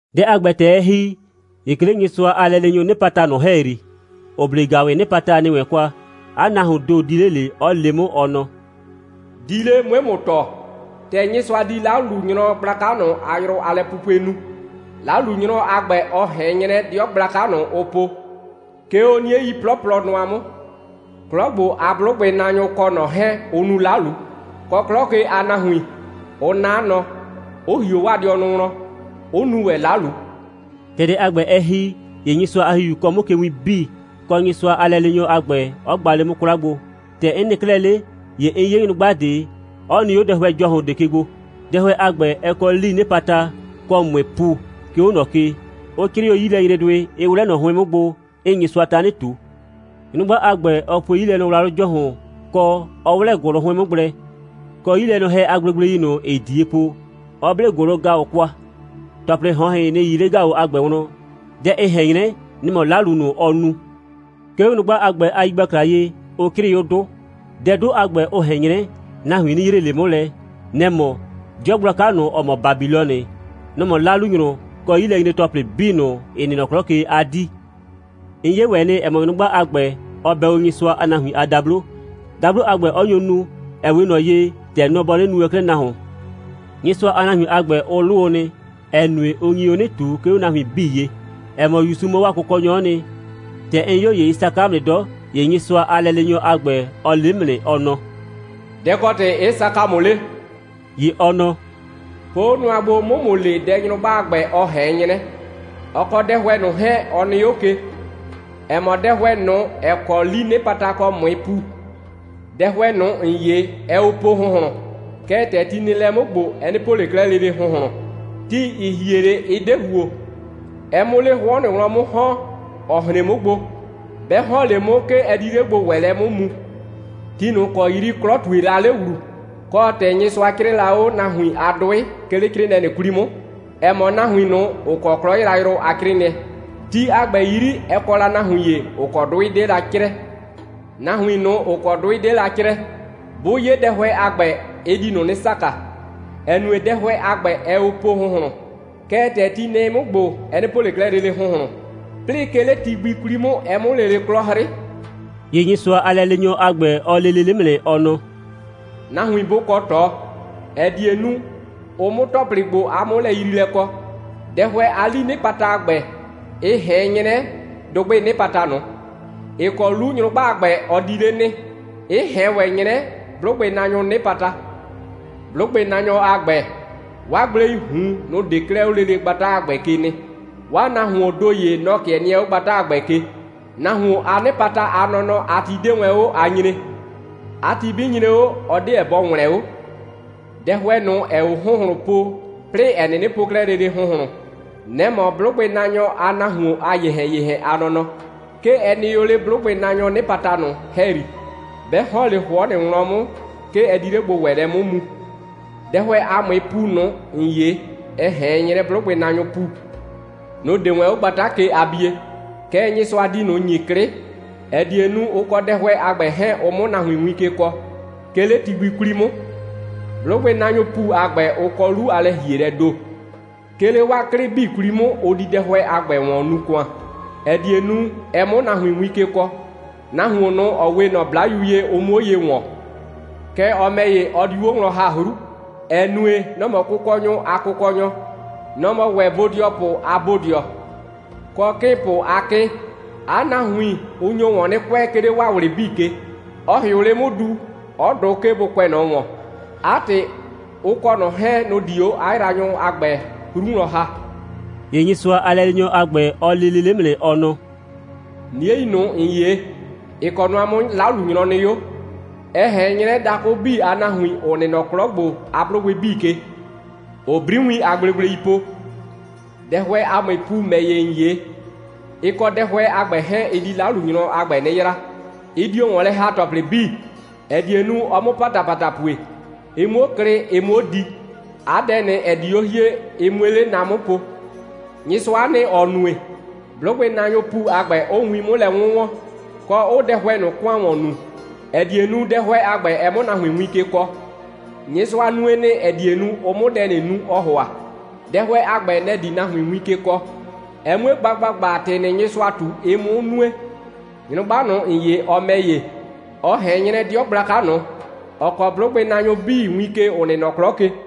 Dɛ a ‑gbɛ, ‑tɛ ɛ ‑hi, ‑ye 'ke 'le Nyɩsʋa a lɛleenyʋʋ 'nɩpata ꞊nʋ ‑hɛyri, ‑ʋ 'ble ‑gaʋwɩɩ 'nɩpata ‑nɩ wɛn kwa, 'a nahuoon ‑do di 'le, 'ɔ le 'mʋ, ɔ nɔ: «Di 'le, 'mue ‑mʋ tɔɔ, ‑tɛ Nyɩsʋa di 'lalunyrɔ gblaka ꞊nʋ a yrʋ a lɛpupue nu. 'Lalunyrɔ a ‑gbɛ, ɔ ꞊hɛn 'nyrɛ 'dɩɔ gblaka ꞊nʋ, ʋ po, 'ke 'o 'niei 'plɔplɔ nʋa 'mʋ. 'Klɔ ‑gbo a 'blʋgbɩnaanyʋ kɔ ꞊nɔ 'hɛɛn, ʋ nu 'lalu, kɔ, 'klɔ ke a nahuin 'ʋ 'na 'a nɔ, 'ʋ ‑hio 'waa dɩɔnʋ wlɔn, 'ʋ nu ‑wɛ 'lalu.» ‑Tɛ dɛ a ‑gbɛ, ɛ ‑hi, ‑ye Nyɩsʋa a ‑Hihiu kɔɔ 'mʋ ke win 'bii, kɔ, Nyɩsʋa a lɛleenyɔ a ‑gbɛ, 'ɔ gba 'le 'mʋ 'kwla gbo. ‑Tɛ 'n nɩ 'klɛɛ 'le, ‑ye 'n 'ye nyrʋgba ꞊de, 'ɔ nɩ 'o dɛhʋɛ ‑jɔhʋn ꞊de ke gbo. Dɛhʋɛ a ‑gbɛ, ɛ kɔ 'lii 'nɩpata kɔ ꞊mʋɩɩ ‑pu, 'ke 'o ꞊nɔ ke, 'ʋ 'crɩɩ 'o 'yilɛnyredʋɩ, 'ɩ 'wlɛ ꞊nɔ 'hʋɩn 'mʋ gbo, 'ɩɩ Nyɩsʋa tanɩ ꞊tu. Nyrʋgba a ‑gbɛ, ɔ pue 'yilɛnɔwlawlʋ ‑jɔhʋn, kɔ, 'ɔ 'wlɛ ‑gʋlʋ 'hʋɩn 'mʋ gblɛ, kɔ 'yilɛnɔhɛ a gblegblei ꞊nʋ, ‑ɩɩ ꞊die po, 'ɔ 'ble ‑gʋlʋ‑gaʋ kwa. ‑Tɔplɩ ꞊hɔnhɩn, nɩ‑ 'yii 'le ‑gaʋ a ‑gbɛ wlɔn. Dɛ ɩ ꞊hɛn 'nyrɛ, nɛ‑ mɔ 'lalu ꞊nʋ, ɔɔ nu. 'Ke 'o nyrʋgba a ‑gbɛ a yigbakla ye, ʋ 'crɩɩ 'o 'dʋ. Dɛ 'dʋ a ‑gbɛ, ʋ ꞊hɛn 'nyrɛ, nahuin 'nɩ yree ꞊le 'mʋ lɛ. Nɛ‑ mɔ: 'dɩɔ gblaka ꞊nʋ, ‑ɔ mɔ Babilɔnɩ, nɔ‑ mɔ 'lalunyrʋ kɔ 'yilɛnyre‑tɔplɩ 'bii ꞊nʋ, ‑ɩ nɩ nɔ 'klɔ ke a 'dii. 'N 'ye ‑wɛ nɩ, ‑ɛ mɔ, nyrʋgba a ‑gbɛ, ɔ bɛ o Nyɩsʋa a nahuin a dablo, dablo a ‑gbɛ 'ɔ nyo nu, ‑ɛ 'we ꞊nɔ ye, ‑tɛ nɔ bɔ 'nɩnɩ nu wɛn 'klɛɛ nahuon. Nyɩsʋa a nahuin a ‑gbɛ, ʋ 'lʋ o nɩ, ‑ɛ nue, ʋ nyi o 'nɩ ꞊tu, 'ke 'o nahuin 'bii ye, ‑ɛ mɔ, ‑Yusu mɔ 'waa Kʋkɔnyɔ'ɔ nɩ. ‑Tɛ 'n 'yo, ‑ye ɩ saka 'mʋ nɩ 'dɔ. ‑Ye Nyɩsʋa a lɛleenyɔ a ‑gbɛ, ɔ le 'mʋ nɩ, ɔ nɔ: «Dɛ‑ kɔ ‑tɩ 'ɩ saka ‑mʋ 'le?» ‑Ye ɔ nɔ: «Po 'o nʋa gbo, 'mʋ ‑mʋ le, dɛ nyrʋgba a ‑gbɛ, ɔ ꞊hɛn 'nyrɛ, ɔ kɔ dɛhʋɛ ꞊nʋ 'hɛɛn, ɔ nɩ 'o ke, ‑ɛ mɔ dɛhʋɛ ꞊nʋ, ‑ɛ kɔ 'lii 'nɩpata kɔ ꞊mʋɩɩ ‑pu. Dɛhʋɛ ꞊nʋ, ‑n 'ye, ɛɛ o po ‑hʋnhlʋn. Kɛɛ, ‑tɛ ti nɩ lɛ 'mʋ ‑gbo, ɛ 'nɩ po ꞊le 'klɛɛ lele ‑hʋnhlʋn. Ti, ‑ɩ hie 'le, ɩ 'de ‑huo, ɛ 'mʋ 'le 'hʋɔ ꞊nʋ wlɔn 'mʋ ‑hɔn, ‑ɔ hren 'mʋ gbo. 'Bɛ ‑hɔn 'le 'mʋ, 'ke ɛ di 'le gbo‑wɛɛlɛ 'mʋ mu. Ti ꞊nʋ ‑kɔ 'yri 'klɔ ꞊tue la 'le ‑wlu, kɔ, ‑tɛ Nyɩsʋa 'crɩɩ la 'o nahuin a 'dʋɩ, 'ke 'le 'crɩɩnɩɛ ꞊nʋ 'kwli 'mʋ, ‑ɛ mɔ nahuin ꞊nʋ, ‑ʋ kɔ 'klɔ yrayrʋ a 'crɩɩnɩɛ, ti a ‑gbɛ 'yri, ɛ kɔ la nahuin ‑ye, ‑ʋ kɔ 'dʋɩ 'de la 'crɛɛ. Nahuin ꞊nʋ, ‑ʋ kɔ 'dʋɩ 'de la 'crɛɛ, 'bʋ 'ye dɛhʋɛ a ‑gbɛ, ɩ di ꞊nʋ 'nɩ saka, ‑ɛ nue, dɛhʋɛ a ‑gbɛ, ɛɛ o po ‑hʋnhlʋn, kɛɛ, ‑tɛ ti nɛ 'mʋ ‑gbo, ɛ 'nɩ po ꞊le 'klɛɛ lele ‑hʋnhlʋn, 'plɩɩ, 'ke 'le ti gbi 'kwli 'mʋ, ɛ 'mʋ lele 'klɔ 'hrɩ.» ‑Ye Nyɩsʋa a lɛleenyɔ a ‑gbɛ, ɔ le lele 'mʋ nɩ, ɔ nɔ: «Nahuin bʋ kɔ ꞊tɔ, ‑ɛ die nu, ʋ 'mʋ ‑tɔplɩ ‑gbo a 'mʋlɛyriilɛ kɔ. Dɛhʋɛ a 'lii 'nɩpata a ‑gbɛ, ɩ ꞊hɛn 'nyrɛ dʋgbɩɩ 'nɩpata ꞊nʋ, ‑ɩ kɔ 'lu nyrʋgba a ‑gbɛ, ɔ di 'le nɩ, 'ɩ ꞊hɛn ‑wɛ 'nyrɛ 'blʋgbɩnaanyʋʋ 'nɩpata. 'Blʋgbɩnaanyʋ a ‑gbɛ, 'waa gbleii ꞊hun, nʋ‑ 'de 'klɛɛ 'o lele gbata a ‑gbɛ ke nɩ. 'Waa nahuoon ‑do ‑ye, nɔ‑ 'kɩɛ nɩɛ 'o gbata a ‑gbɛ ke. Nahuon a 'nɩpata a nɔnɔ a ti 'de wɛn 'o a nyree. 'A ti 'bɩ nyre 'o, ɔ 'deɛ bɔ ‑wlɛn 'o. Dɛhʋɛ ꞊nʋ, ‑ɛɛ o ‑hʋnhlʋn po, 'plɩɩ ‑ɛ 'nɩnɩ po 'klɛɛ lele ‑hʋnhlʋn, nɛ‑ mɔ 'blʋgbɩnaanyʋ a nahuon a ‑yehɛn‑yehɛn a nɔnɔ. 'Ke ɛ nɩ o 'le 'blʋgbɩnaanyʋʋ 'nɩpata ꞊nʋ ‑hɛyri. 'Bɛ ‑hɔn 'le 'hʋɔ ꞊nʋ wlɔn 'mʋ, 'ke ɛ di 'le gbo‑wɛɛlɛ 'mʋ mu. Dɛhʋɛ a ꞊mʋɩɩ ‑pu ꞊nʋ, ‑n 'ye, ɩ ꞊hɛn 'nyrɛ 'blʋgbɩnaanyʋʋ ‑pu. Nʋ‑ 'de wɛn 'o gbata ke a bie. Kɛɛ, Nyɩsʋa di ꞊nʋ ‑nyi 'klɩ, ‑ɛ die nu, ʋ kɔ dɛhʋɛ a ‑gbɛ 'hɛɛn, ʋ 'mʋ nahuin win ke kɔɔ, 'ke 'le ti gbi 'kwli 'mʋ. 'Blʋgbɩnaanyʋʋ ‑pu a ‑gbɛ, ʋ kɔ 'lu a lɛ‑hielɛɛ ‑do. 'Ke 'le 'waa 'klɩ 'bii 'kwli 'mʋ, ʋ di dɛhʋɛ a ‑gbɛ ‑wɔn nuu ‑kʋan, ‑ɛ die nu, ɛ 'mʋ nahuin win ke kɔɔ, nahuon ꞊nʋ, ‑ɔ 'we ꞊nɔ 'Blayu ye, ʋ 'muo ye ‑wɔn. Kɛɛ, ɔ ‑mɛ ‑ye, ɔ diu 'o wlɔn ‑ha 'hru, ‑ɛ nue, nɔ‑ mɔ kʋkɔnyʋ a Kʋkɔnyɔ, nɔ‑ mɔ ‑wɛ bodɩɔpʋ a Bodɩɔ, kɔ 'kɩɩnpʋ a 'Kɩɩn. 'A nahuin, ʋ nyo ‑wɔn 'nɩ kʋɛ, 'ke 'le 'waa ꞊wlɩ 'bii ke. Ɔ ‑hɩʋ 'le 'mʋ du, 'ɔ dʋ, 'ke bʋ kʋɛ ꞊nɔ ‑wɔn. 'A ‑tɩ, ʋ kɔ ꞊nɔ 'hɛɛn, nʋ‑ di 'o 'a yraanyʋ a ‑gbɛ 'hru wlɔn ‑ha.» ‑Ye Nyɩsʋa a lɛleenyɔ a ‑gbɛ, ɔ le lele 'mʋ nɩ, ɔ nɔ: «'Niei ꞊nʋ, ‑n 'ye, ‑ɩ kɔ nʋa 'mʋ 'lalunyrɔ nɩ 'o, ɛ ꞊hɛn 'nyrɛ dakʋ 'bii a nahuin, ‑ʋ nɩ nɔ 'klɔ ‑gbo a 'blʋgbɩ 'bii ke, ‑ʋʋ 'briwiin a gblegblei po. Dɛhʋɛ a ꞊mʋɩɩ ‑pu ‑mɛ ‑ye, ‑n 'ye, ɩ kɔ dɛhʋɛ a ‑gbɛ 'hɛɛn, ɩ di 'lalunyrɔ a ‑gbɛ 'nɩ yraa. Ɩ dio ‑wɔn lɛ ‑ha ‑tɔplɩ 'bii, ‑ɛ die nu, ɔ 'mʋ ‑patapata pue, ɩ 'muo klɩ, ɩ 'muo di. 'A dɛ ꞊nʋ, ‑ɛ di 'o hie, ɩ 'mue 'le na 'mʋ po. Nyɩsʋa'a nɩ, ‑ɔ nue, 'blʋgbɩnaanyʋʋ ‑pu a ‑gbɛ, 'ʋʋ win 'mʋ lɛ 'wʋnwɔn, kɔ, 'ʋʋ dɛhʋɛ ꞊nʋ ‑kʋan ‑wɔn nuu, ‑ɛ die nu, dɛhʋɛ a ‑gbɛ, ɛ 'mʋ nahuin win ke kɔɔ. Nyɩsʋa nue nɩ, ‑ɛ die nu, ʋ 'mʋ dɛ ꞊nʋ nu, ɔɔ ‑hʋa. Dɛhʋɛ a ‑gbɛ, nɛ‑ di nahuin win ke kɔɔ, ɛ 'mue gba ‑gbagba, ‑tɩ ꞊nʋ, Nyɩsʋa ꞊tu, ɩ 'mʋ nue. Nyrʋgba ꞊nʋ, ‑n 'ye, ɔ ‑mɛ ‑ye, ɔ ꞊hɛn 'nyrɛ 'dɩɔ gblaka ꞊nʋ, ‑ɔ kɔɔ 'blʋgbɩnaanyʋ 'bii win ke, ‑ʋ nɩ nɔ 'klɔ ke.»